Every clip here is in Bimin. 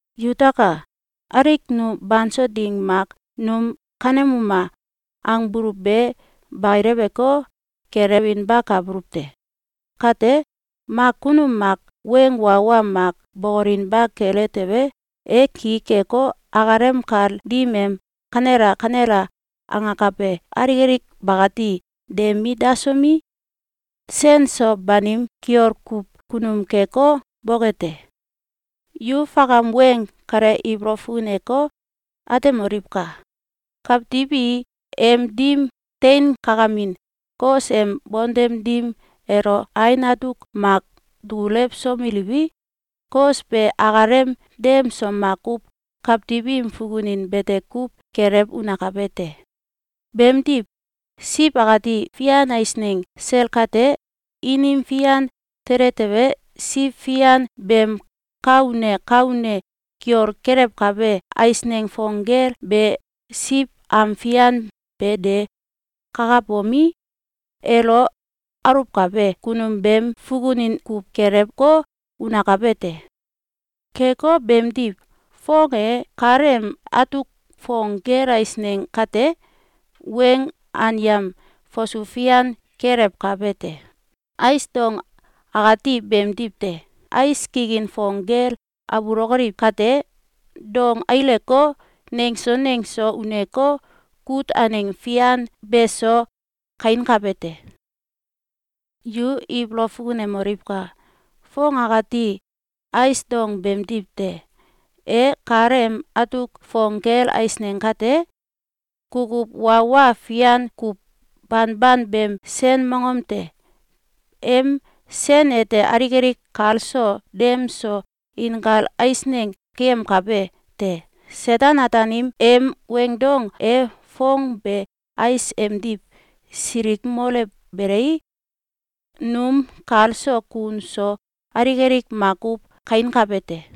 Yutaka! Alik nu banso ding mak num “Kanemuma!”, angbuluw be bakileweko, gelewinbakabuluw te. Kate, mak kunum mak weng wa wa mak bokolinba kele tewe, e ki keko, akalem kal dim em “Kanela! Kanela!”, angakabe alik alik bakati de mit dasomi, sen so banim kiol kuw kunum keko, boke te. Yu fakam weng kale ibolow fukuneko, atemoliwka! Kawtiw i em dim tein kakamin kos em bontem dim elo ain atuk mak dukulewsomeliwi, kos be akalem dem so makuw kawtiw im fukunin bete kuw gelew unakabe te. Beemdiw, siw akati fian eisneng sel kate, inim fian tele tewe, siw fian beem ka une ka une kiol kelewkabe eisneng fong gel be siw am fian be de kakabomi, elo aluwkabe kunum beem fukunin kuw gelewko, unakabe te. Keko beemdiw, foong e kal em atuk fong gel eisneng kate, weng anyam fasu fian kelewkabe te. Ais dong akati beemdiw te. Ais kikin fong gel abulokoliw kate, dong aileko, nengso nengso uneko, kut aneng fian beso kainkabe te. Yu ibolow fukunemoliwka! Foong akati ais dong beemdiw te. E kal em atuk fong gel eisneng kate, kukuw wa wa fian kuw banban beem sen mongom te. Em sen ete alik alik kal so dem so inkal eisneng keyemkabe te. Seten-Ataanim em weing dong e foong be ais emdiw silikmolewbelei, num kal so kun so alik alik makuw kainkabe te.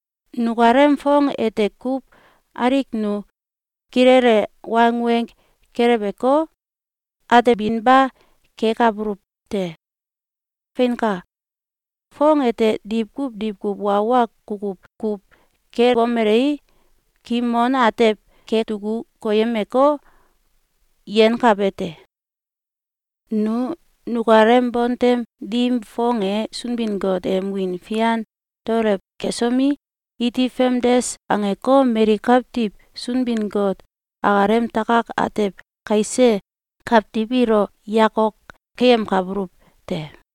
nukalem foong ete kuw alik nu kilele wangweng keleweko, atebinba kekabuluw te. Feinka! Foong ete diwkuw diwkuw wa wa kukuw kuw kebomelei, kimon atew keduku koyemeko, yenkabe te. Nu nukalem bontem dim foong e Sunbin-Got em wiin fian daolew kesomi, iti famdes angeko, mali kawtiw Sunbin-Got akalem takak atew kaise kawtiw ilo yakok keyemkabuluw te.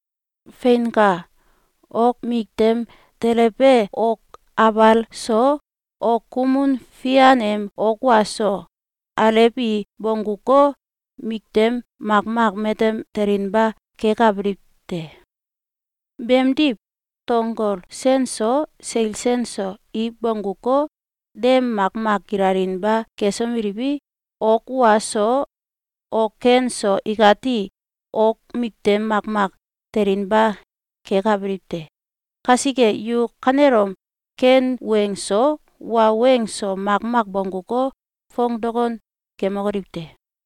Feinka! Ok miktem telebe ok abal so, ok kumun fian em ok wa so, alew i bongguko, miktem makmak matem telinba kekabiliw te. Beemdiw, tonggol sen so, seil sen so, i bongguko, dem makmak gilalinba kesomeliwi, ok wa so ok ken so ikati ok miktem makmak telinba kekabiliw te. Kasike yu kanelom ken weng so, wa weng so, makmak bongguko, foong dokon kemokoliw te!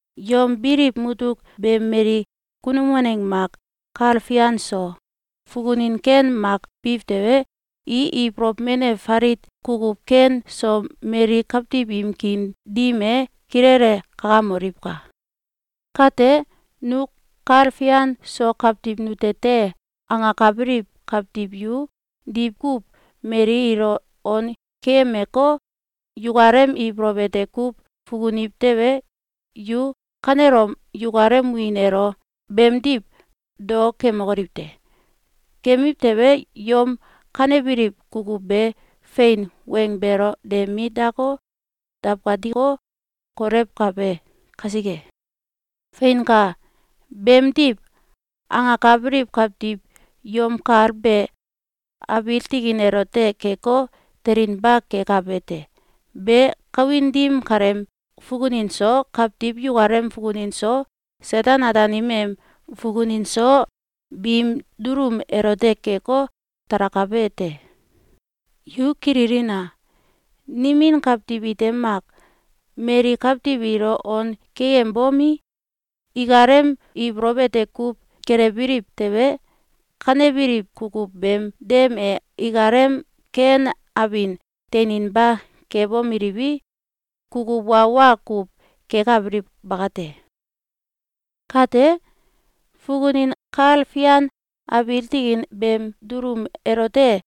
Yom biliw mutuk be mali kunum waneng mak kal fian so fukunin ken mak biw tewe, i ibolow menew falit kukuw ken so mali kawtiw im kiin dim e kilele kakamoliwka! Kate, “Nu kal fian so kawtiw nute te!”, angakabiliw kawtiw yu diwkuw mali ilo on keyemeko, yukalem ibolow ete kuw fukuniw tewe, yu kanelom yukalem wiin elo beemdiw dao kemokoliw te! Kemiw tewe, yom kanebiliw kukuw be fein weng beelo de mit dako, dawkatiko, kolewkabe kasike. Feinka! Beemdiw angakabiliw kawtiw yom kal be abiil tikin elote keko, telinba kekabe te. Be kawin dim kaleem fukunin so, kawtiw yukalem fukunin so, Seten-Ataanim em fukunin so, biim dulum elote keko, talakabe te. Yu kililina! Nimin kawtiw ite mak mali kawtiw ilo on keyembomi, ikalem ibolow ete kuw gelewbiliw tewe, kanebiliw kukuw beem dem e ikalem ken abin teininba kebomeliwi, kukuw wa wa kuw kekabiliw bakate. Kate, fukunin kal fian abiil tikin beem dulum elote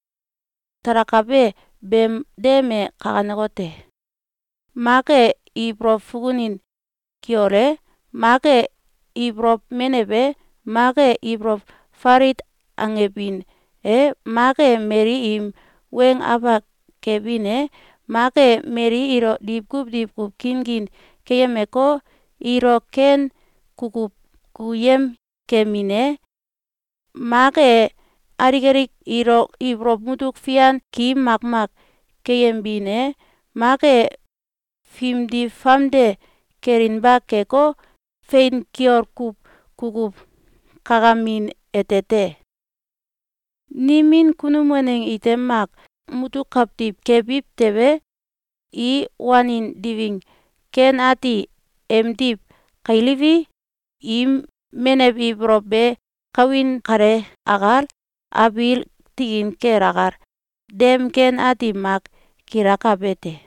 talakabe beem dem e kanekote: Mak e ibolow fukunin kiol e, mak e ibolow menew e, mak e ibolow falit angebin e, mak e mali im weng afak kemin e, mak e mali ilo diwkuw diwkuw kinkin keyemeko, ilo ken kukuw kukuyem kemin e, mak e alik alik ilo ibolow mutuk fian ki makmak keyembin e, mak e fimdi famde kelinba keko, fein kiol kuw kukuw kakamin ete te. Nimin kunum waneng ite mak mutuk kawtiw kebiw tewe, i wanin diwing ken ati emdiw kailiwi, im menew ibolow be kawin kale akal, abiil tikin kel akal, dem ken ati mak gilakabe te.